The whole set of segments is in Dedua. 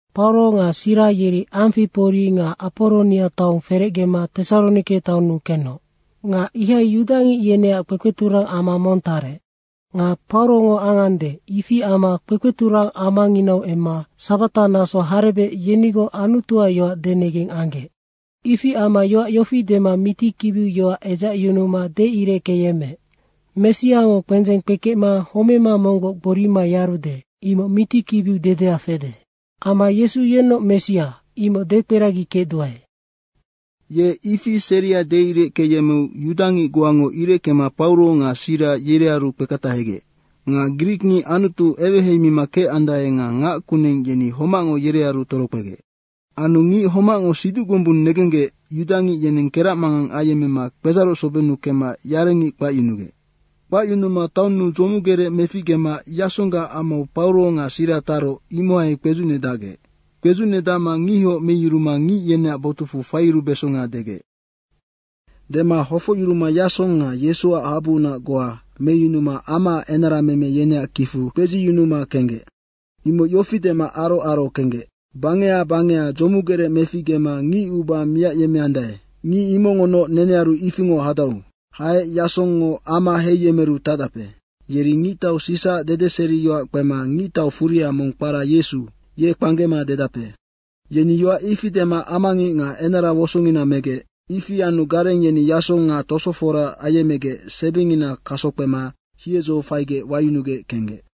Pauro nga Sira yeri Amfipori nga Aporonia taong ferecgema Tesaronike taonnu kenoc. Nga ihai yudangic yeneac kpekpeturang ama mong tarec. Nga Paurongo angande, ifi amma kpekpeturang amanginau emma sabata naso harebec yenigoc Anutuac yoac denegeng anggec. Ifi amma yoac yofi dema mitikibiu yoac edzacyunuma deireckeyemmeec, “Messiango kpendzeng kpekecma homema monggoc gborima yarude, imoc mitikibiu dedea fede. Amma Yesu yennoc Messia, imoc dekperagikecduae.” Ye ifi seria deireckeyemmeu yudangic goango ireckema Pauro nga Sira, yerearu kpeketahegec. Nga grikngic Anutu eweheimima kecandae nga ngac kuneng yeni homacngo yerearu torokpegec. Anu ngic homacngo siduc gombung negenggec yudangic yeneng keracmangang ayemmema kpedzaroc sobennu kemma yarengic kpacyunugec. Kpacyunuma taonnu dzomugerec meficgema Yasonggac amau Pauro nga Sira taroc, imohai kpedzucnedacgec. Kpedzucnedacma ngihoc meyuruma ngic yeneac botucfu faiyurubesonga degec. Dema hofocyuruma Yasong nga Yesuac habuunac goa meyunuma amaac enarameme yeneac kicfu kpedziyunuma kenggec. Imoc yofi dema aro aro kenggec, “Bangeha bangeha dzomugerec meficgema ngicuba miacyemmeandae, ngic imongonoc nenearu ifingoc hadau. Haec Yasongngo ama heiyemeru tacdape. Yeri Ngictau Sisaac dedeseriyoac kpema ngictau furia mong kpara Yesu, ye kpanggema dedape.” Yeni yoac ifi dema amangic nga enara wosongina megec. Ifi anu gareng yeni Yasong nga tosofora ayemmegec sebingina kaso kpema hiedzo faigec wayunugec kenggec.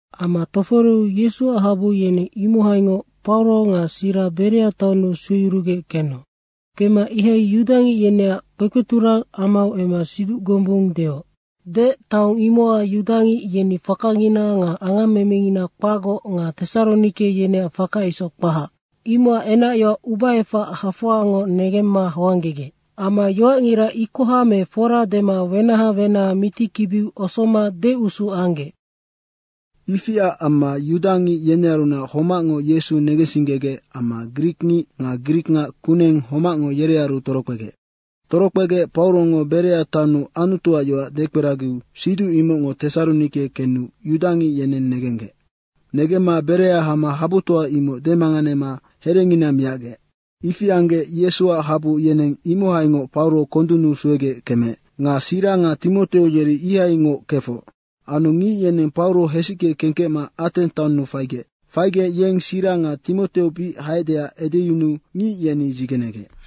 Ama toforeu Yesuac habu yeneng imohaingoc Pauro nga Sira Berea taonnu sueyurugec kenoc. Kemma ihai yudangic yeneac kpekpeturang amau emma siduc gombung deoc. Deec taong imocac yudangic yeni fakangina nga angammemengina kpacgoc nga Tesaronike yeneac faka isoc kpahac, imocac enacyoac ubaefac hafoangoc negemma hoanggegec. Amma yoacngira ikoha me fora dema wenaha wenaha mitikibi osoma deusu anggec. Ifiac amma yudangic yenearunac homacngo Yesu negensinggegec amma grikngic nga grikngac kuneng homacngo yerearu torokpegec. Torokpegec Paurongo Berea taonnu Anutuac yoac dekperagiu siduc imocngo Tesaronike kenu yudangic yeneng negenggec. Negemma Berea hama habutoa imoc demanganema herengina miacgec. Ifi anggec Yesuac habu yeneng imohaingoc Pauro kondunnu suegec kemeec. Nga Sira nga Timoteo yeri ihaingoc kefoc. Anu ngic yeneng Pauro hesicke kengkecma Ateng taonnu faigec. Faigec yeng Sira nga Timoteo bic haecdeac edeyunuu ngic yeni dzigenegec.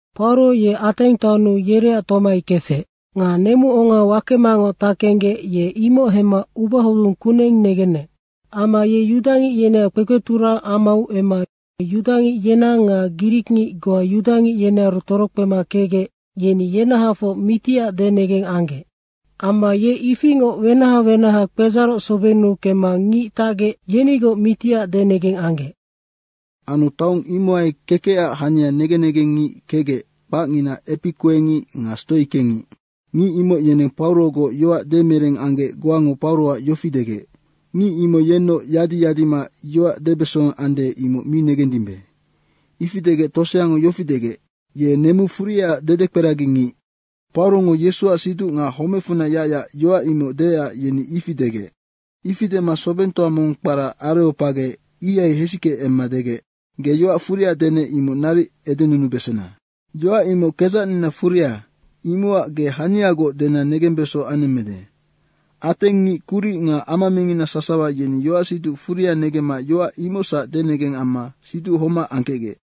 Pauro ye Ateng taonnu yereac tomai kefec. Nga nemuonga wakemangoc tackenggec ye imoc hemma ubahodung kuneng negenec. Amma ye yudangic yeneac kpekpeturang amau emma yudangic yenang nga grikngic goa yudangic yenearu torokpema kecgec, yeni yenahafoc mitiac denegeng anggec. Amma ye ifingoc wenaha wenaha kpedzaroc sobennu kemma ngic tacgec, yenigoc miti denegeng anggec. Anu taong imohai kekecac hania negen negengngic kecgec, kpacngina epikuengic nga stoikengic. Ngic imoc yeneng Paurogoc yoac demereng anggec goango Pauroac yofi degec, “Ngic imoc yennoc yadi yadima yoac debeso ande, imoc mi negendimbe.” ifi degec toseango yofi degec, “Ye nemu furiaac dedekperagi ngic.” Paurongo Yesuac siduc nga homecfunac yacyac, yoac imoc deecac yeni ifi degec. Ifi dema sobengtoa mong kpara Areopage ihai hesicke emma degec, “Ge yoac furia denec, imoc naric edenunubesena. Yoac imoc kedzacnina furia, imocac ge haniagoc dena negembeso anemmede.” Ateng ngic kuric nga ama mingina sasawa, yeni yoacsiduc furia negemma yoac imocsac denegeng amma siduc homac angkecgec.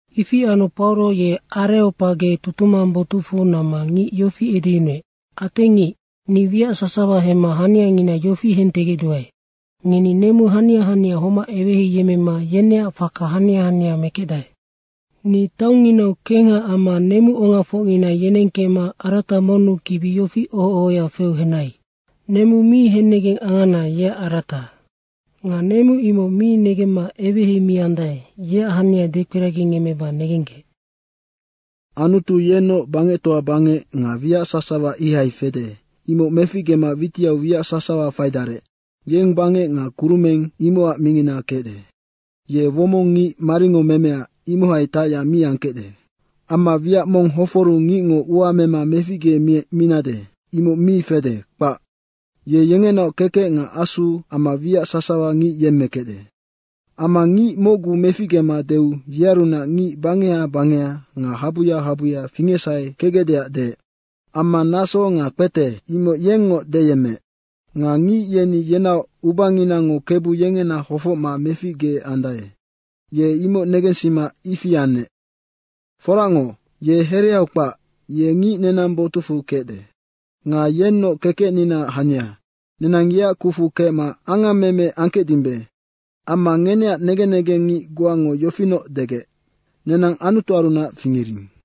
Ifi anu Pauro ye Areopage tutumang botucfu namma ngic yofi edeyunuec, “Ateng ngic, ni wiac sasawa hemma haniangina yofi hentegecduae, ngeni nemu hania hania homac eweheiyemmema yeneac faka hania hania mekecdae. Ni taongnginau kengha amma nemuongafocngina yenengkecma arata monnu kibi yofi oho ohoya feu henai, ‘Nemu mi hennegeng angana, yeac arata.’ Nga nemu imoc mi negemma eweheimiandae, yeac hania dekperagingemmeba negenggec. Anutu yennoc bangectoa bangec nga wiac sasawa ihai fede, imoc meficgema witiau wiac sasawa faidarec, yeng bangec nga kurumeng imocac mingina kecde. Ye womong ngic maringo memea, imohai tacyac mi angkecde. Amma wiac mong hoforu ngicngo ua mema meficgeminade, imoc mi fede, kpac. Ye yengenaoc kekec nga asu amma wiac sasawa ngic yemmekecde. Amma ngic mocgu meficgema deu yearunac ngic bangeha bangeha nga habuya habuya fingecsahe kecgecdeac deec. Amma naso nga kpete, imoc yengngoc deyemmeec. Nga ngic yeni yenaoc ubanginango Kebu yengena hofocma meficgeandae, ye imoc negensima ifi anec. Foracngoc, ye hereau kpac, ye ngic nenang botucfu kecde. Nga yennoc kekecninaac hania, nenang yeac kucfu kecma angammeme angkecdimbe. Amma ngeneac negen negengngic goango yofinoc degec, ‘Nenang Anutuarunac fingering.’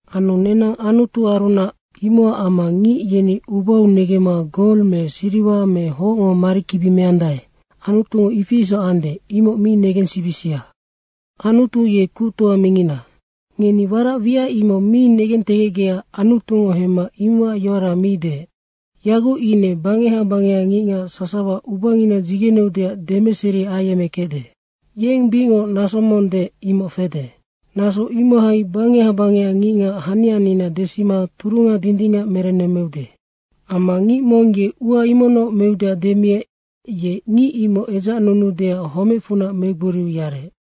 Anu nenang Anutuarunac, imocac amma ngic yeni ubau negemma gol me siriwa me hocngo marikibi meandae, Anutungo ifi isoc ande, imoc mi negensibisia. Anutu ye kuctoa mingina. Ngeni warac wiac imoc mi negentegecgecac Anutungo hemma imocac yoara mi deec. Yaguc ine bangeha bangeha ngicngac sasawa ubangina dzigeneudeac demeseri ayemmekecde. Yeng bicngoc naso mong deec, imoc fede. Naso imohai bangeha bangeha ngicngac hanianina desima turunga dindingac merennemmeude. Amma ngic mong ye ua imocnoc meudeac demiec, ye ngic imoc edzacnunuudeac homecfunac megboriu yarec.”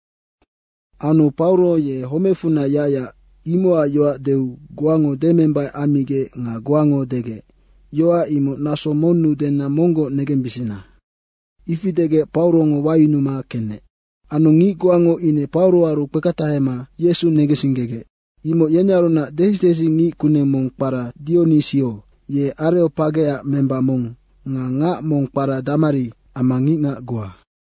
Anu Pauro ye homecfunac yacyac, imocac yoac deu goango demembaic ammigec nga goango degec, “Yoac imoc naso monnu dena monggoc negembisina.” Ifi degec Paurongo wayunuma kenec. Anu ngic goango ine Pauroaru kpeketahema Yesu negensinggegec. Imoc yenearunac desi desi ngickuneng mong kpara Dionisio, ye Areopageac memba mong nga ngac mong kpara Damari, amma ngicngac goa.